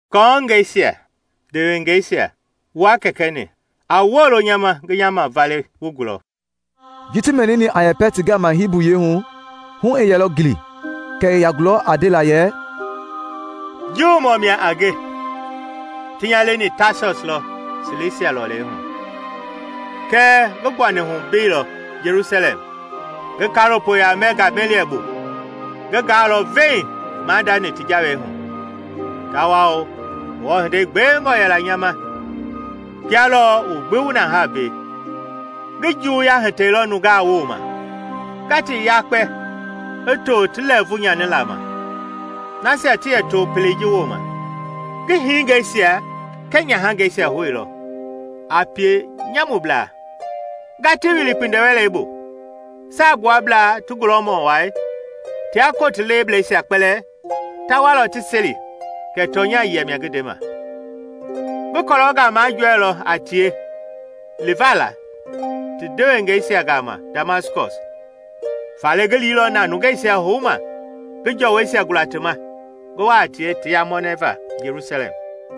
“Kɔɔngɛisia, ndewengeisa wua kɛkɛ-ni, a wolo nya ma ngi nya mavale wu gulɔ.” Ji ti mɛnini a yɛpɛ ti gama Hibu yiɛi hu, hu i yɛlɔ gili kɛ i ya gulɔ a ndela yɛ, “Juumɔ mia a nge, ti nya leni Taasɔs lɔ Silisia lɔlei hu; kɛɛ ngi gbuani hu mbeilɔ Jelusalɛm ngi kaalopoya mɛ Gameliɛl bu. Ngi gaalɔ veiŋ maadani ti jawei hu, tawao Ngewɔ hinde gbewengɔ yɛla nya ma kia lɔ wu gbi wu na haa mbei. Ngi juwuya hitɛilɔ nungaa woma nga ti yakpe i too ti lɛɛvu nyanila ma, nasia ti yɛ to pelei ji woma. Ngi hingeisia kɛɛ nyahangeisia houilɔ a pienyamublaa nga ti wili kpindiwɛlɛbu. Saagbuablaa ti gulɔmɔ wai tia koti lebleisia kpɛlɛɛ ta walɔ ti seli kɛ tɔnya yia mia ngi ndema. Ngi kɔlɔngaa majɔɛilɔ a tie livala ti ndewengeisia gama Damaskɔs, faale ngi liilɔ na nungeisia houma ngi jɔwɔisia gula ti ma ngi wa a tie ti yamɔnɛ va Jelusalɛm.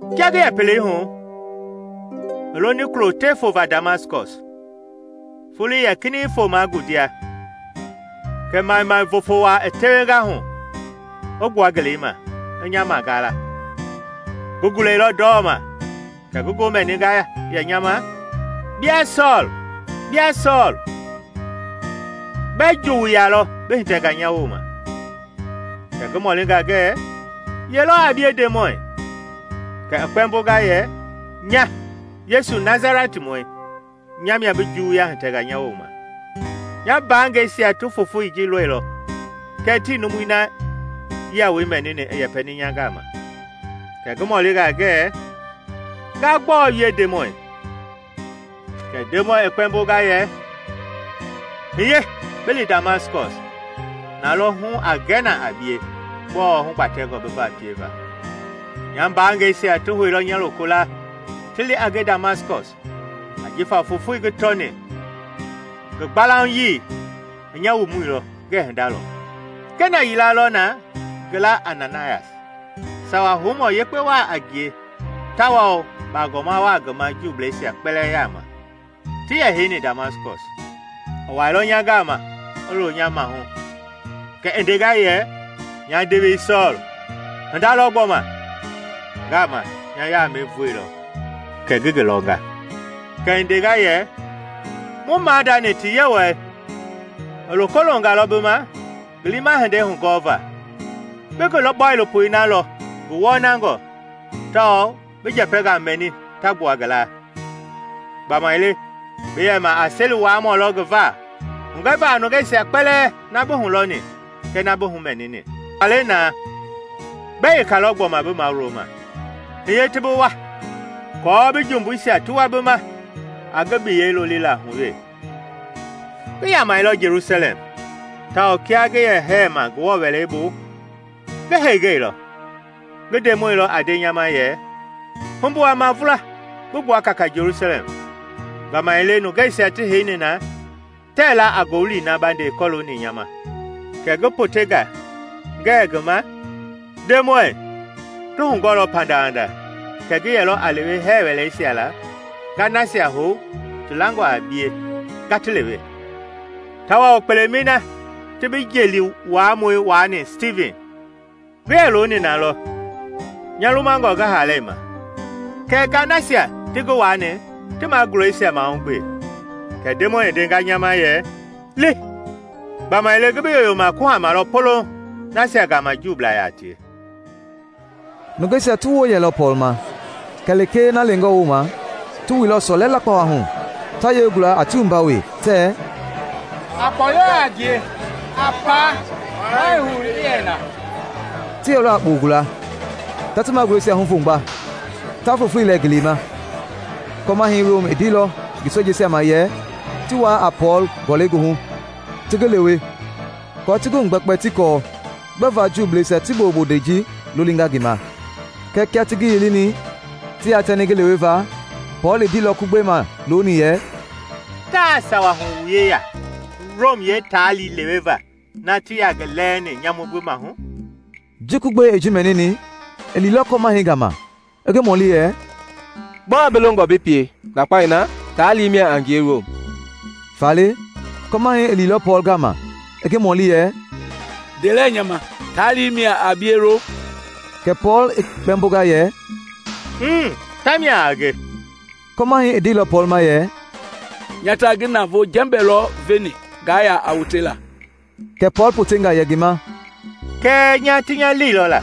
“Kia ngi yɛ pelei hu i loni kulo te fova Damaskɔs, foloi yɛ kinɛiŋ fomaa ngundia kɛ maimai vofo waa i tewenga hu a gbua ngeleima i nya magaala. Ngi gulɛilɔ ndɔma kɛ ngi ngoo mɛninga yɛ nya ma, ‘Bia Sɔɔl, bia Sɔɔl! Gbɛɛ juwuya lɔ bi hitɛnga nya woma?’ Kɛ ngi humɔlinga ngɛ, ‘Yelɔ a bie Ndemɔi?’ Kɛ i kpɛmbonga yɛ, ‘Nya Yesu, Nasalɛtimɔi, nya mia bi juwuya hitɛnga nya woma.’ Nya mbaangɛisia ti fofoi ji lɔilɔ kɛɛ tii numui na yia woi mɛnini i yɛpɛni nya gama. Kɛ ngi mɔlinga ngɛ, ‘Nga gbɔɔ wie Ndemɔi?’ Kɛ Ndemɔi i kpɛmbonga yɛ, ‘Hiye bi li Damaskɔs, nalɔ hu a gɛ na a bie gbɔɔ hubatɛngɔ bi va pieva.’ Nya mbaangɛisia ti houilɔ nya lokolaa ti li a nge Damaskɔs, ajifa fofoi ngi tɔni ngi gbalaunyii i nya wumuilɔ ngɛɛ hinda lɔ. “Kena yila yɛlɔ na ngi laa a Ananayas, sawa houmɔ yekpe wa a ngie tawao bagɔma wa ngi ma Juubleisia kpɛlɛɛ yaama ti yɛ heini Damaskɔs. I wailɔ nya gama i loo nya maahu kɛ i ndenga yɛ, ‘Nya ndewei Sɔɔl, hinda lɔ gbɔma!’ Ngaama nya yaamɛi vooilɔ kɛ ngi ngi lɔnga. Kɛ i ndenga yɛ, ‘Mu maadani ti Yewɔɛi i loko loonga lɔ bi ma ngi liima hinde hugɔlɔva, bi ngi Bɔilopo na lɔ ngi wɔnangɔ tawao bi njɛpɛngaa mɛni ta gbua ngi laa. Gbamaile bi yɛma a seli-wuaamɔ lɔ ngi va hugɛva a nungeisia kpɛlɛɛ na bi hulɔni kɛɛ na bi humɛnini. Faale na, gbɛ yekalɔ gbɔma bi mawulo ma? Hiye ti bi wua aako bi jumbuisia ti wua bi ma a ngi biyɛi lolila hu wee.’” “Ngi yamailɔ Jelusalɛm, tawao kia ngi yɛ hɛɛma Ngewɔ Wɛleibu, ngi heengeilɔ, ngi Ndemɔi lɔ a nde nya ma yɛ, ‘Humbu a mavula bi gbua kaaka Jelusalɛm, gbamaile nungeisia ti heini na tɛɛ la a ngowili na ba nde kɔlooni nya ma.’ Kɛ ngi potenga ngɛɛ ngi ma, ‘Ndemɔi, ti hugɔɔlɔ pandawanda kɛ ngi yɛlɔ a lewe hɛɛ wɛleisia la nga nasia hou ti langɔ a bie nga ti lewe. Tawao kpelemɛi na ti bi jeeli wuamɔi waani Stivin, ngi yɛ looni nalɔ nya lumangɔ ngi haalei ma kɛɛ nga nasia ti ngi waani ti magulɛisia mahugbe.’ Kɛ Ndemɔi i ndenga nya ma yɛ, ‘Li, gbamaile ngi bi yoyoma kuhama lɔ poloŋ nasia gama Juublaa yaa tie.’” Nungeisia ti woo yɛlɔ Pɔɔl ma kɛ lekee na lengɔ wooma; ti wuilɔ sɔlɛ lakpawa hu ta yele gula a ti wumba wee tɛ, “A kpɔyɔ a ngie! A paa! Maa ii hou i yɛ na!” Ti yɛlɔ a kpoo gula, ta ti magulɛisia huvomgba, ta fufulei lɛ ngeleima. Kɔmahɛi Rom i ndeilɔ ngi sojeisia ma yɛ ti wuaa a Pɔɔl gɔlɛi goohu ti ngi lewe aako ti ngi hugbɛkpɛ ti kɔɔ gbɛva Juubleisia ti boo bonde ji lolinga ngi ma. Kɛɛ kia ti ngi yilini ti yatɛni ngi leweva, Pɔɔl i ndeilɔ kugbei ma looni yɛ, “Taa sawa hu wu yeya Rom yeetaali leweva na tii yaa ngi lɛɛni nyamu gbi maahu?” Ji kugbei i ji mɛnini, i liilɔ kɔmahɛi gama i ngi mɔli yɛ, “Gbɔɔ bi longɔ bi pie? Ndakpao na taali mia a ngie Rom!” Faale, kɔmahɛi i liilɔ Pɔɔl gama i ngi mɔli yɛ, “Nde lɛ nya ma, taali mia a bie Rom?” Kɛ Pɔɔl i kpɛmbonga yɛ, “Mmm, tamia a nge.” Kɔmahɛi i ndeilɔ Pɔɔl ma yɛ, “Nya ta ngi navoo jɛmbɛ lɔ veni nga ya a wotela.” Kɛ Pɔɔl potenga yɛ ngi ma, “Kɛɛ nya ti nya leilɔ la.”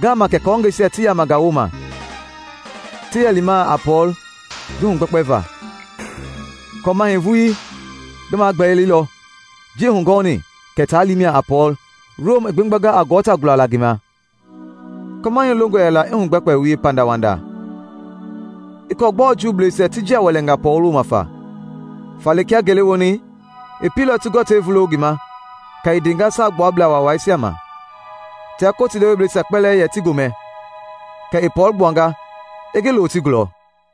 Ngaama kɛ kɔɔngɛisia ti yamanga woma ti yɛ lima a Pɔɔl ngi hugbɛkpɛva. Kɔmahɛi vuii ngi magbɛlilɔ ji i hugɔɔni kɛ taali mia a Pɔɔl Rom i gbegbanga a gɔɔ ta gulala ngi hama. Kɔmahɛi longɔ yɛla i hugbɛkpɛ wie pandawanda i kɔɔlɔ gbɔɔ Juuisia ti njia wɛlɛnga Pɔɔl woma fa; faale kia ngele woni i pielɔ ti gɔɔtei vulo ngi ma kɛ i ndenga Saagbuablaa Waisia ma tia kotilebleisia kpɛlɛɛ yɛ ti gomɛ. Kɛ i Pɔɔl gbuanga i ngi loo ti gulɔ.